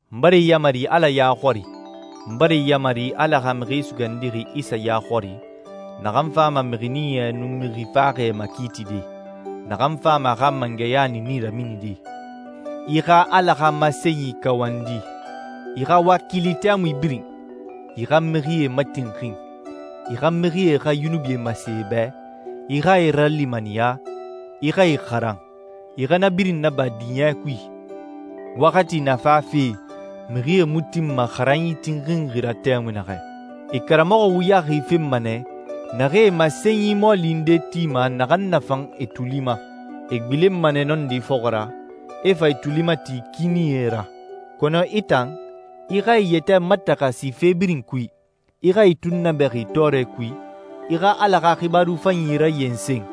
N bara i yamari Ala ya xɔri, n bara i yamari Ala xa Mixi Sugandixi Isa ya xɔri, naxan fama mixi ɲiɲɛe nun mixi faxaxie makiitide, naxan fama a xa mangɛya niini raminide, i xa Ala xa masenyi kawandi, i xa wakili tɛmui birin, i xa mixie matinxin, i xa mixie xa yunubie masen e bɛ, i xa e ralimaniya, i xa e xaran. I xa na birin naba diɲɛ kui. Waxati na fafe mixie mu tinma xaranyi tinxinxi ra tɛmui naxɛ. E karamɔxɔ wuyaxi fenma nɛ, naxee masenyi mɔɔli nde tima naxan nafan e tuli ma. E gbilenma nɛ nɔndi fɔxɔ ra, e fa e tuli mati kiinie ra. Kɔnɔ i tan, i xa i yɛtɛ mataxasi fe birin kui, i xa i tunnabɛxi tɔɔrɛ kui, i xa Ala xa xibaaru fanyi rayensen,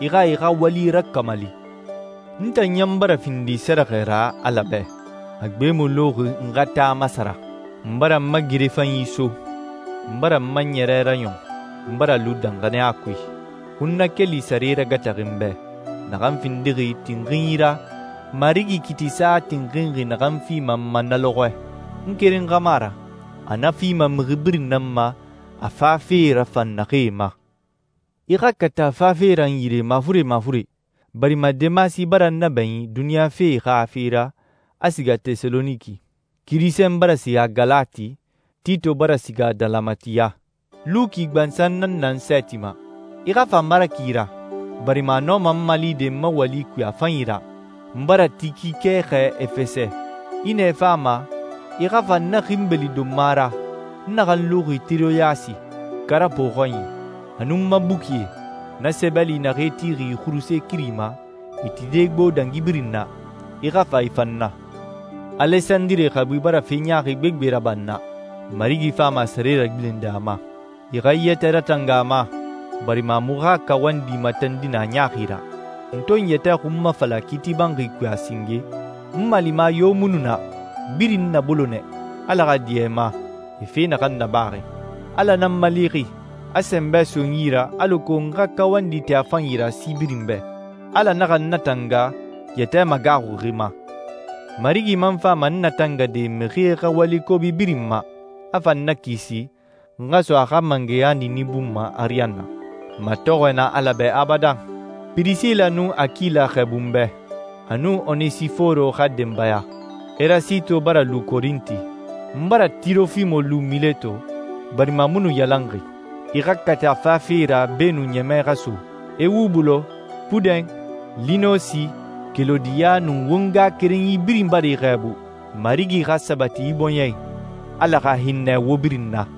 i xa i xa wali rakamali. N tan ɲan bara findi sɛrɛxɛ ra Ala bɛ. A gbe mu luxi n xa taa masara. N bara n ma gere fanyi so, n bara n ma ɲɛrɛ raɲɔn, n bara lu danxaniya kui. Xunnakeli sare ragataxi n bɛ, naxan findixi tinxinyi ra Marigi kiitisa tinxinxi naxan fima n ma na lɔxɔɛ. N keren xa mu a ra, a na fima mixi birin nan ma, a fafe rafan naxee ma. I xa kata fafe ra n yire mafuren mafuren, barima Demasi bara n nabɛɲin duniɲa fe xa fe ra, a siga Tɛsaloniki. Kiresen bara siga Galati, Tito bara siga Dalamatiya. Luki gbansan nan na n sɛɛti ma. I xa fa Maraki ra, barima a nɔma n malide n ma wali kui a fanyi ra. N bara Tikike xɛɛ Efɛsɛ. I nɛ fama, i xa fa na xinbeli donma ra, n naxan luxi Tiroyasi, Karapo xɔnyi, a nun n ma bukie. Na sɛbɛli naxee tixi xuruse kiri ma, e tide gbo dangi birin na, i xa fa e fan na. Alesandire xabui bara fe ɲaaxi gbegbe raba n na. Marigi fama a sare ragbilende a ma. I xa i yɛtɛ ratanga a ma, barima a muxu xa kawandi matandi nɛ a ɲaaxi ra. N to n yɛtɛ xunmafala kiiti banxi kui a singe, n malima yo mu nu na. Birin n nabolo nɛ. Ala xa diɲɛ e ma e fe naxan nabaxi. Ala nan n malixi, a sɛnbɛ so n yi ra, alako n xa kawandi ti a fanyi ra si birin bɛ. Ala naxa n natanga yɛtɛ magaaxuxi ma. Marigi man fama n natangade mixie xa wali kobi birin ma, a fa n nakisi, n xa so a xa mangɛya niini bun ma ariyanna. Matɔxɔɛ na Ala bɛ abadan. Pirisila nun Akila xɛɛbu n bɛ, a nun Onesiforo xa denbaya. Erasito bara lu Korinti. N bara Tirofimo lu Mileto, barima a mu nu yalanxi. I xa kata fafe ra beenun ɲɛmɛ xa so. Ewubulo, Pudɛn, Linosi, Kelodiya, nun won ngaxakerenyi birin bara i xɛɛbu. Marigi xa sabati i bɔɲɛ i, Ala xa hinnɛ wo birin na.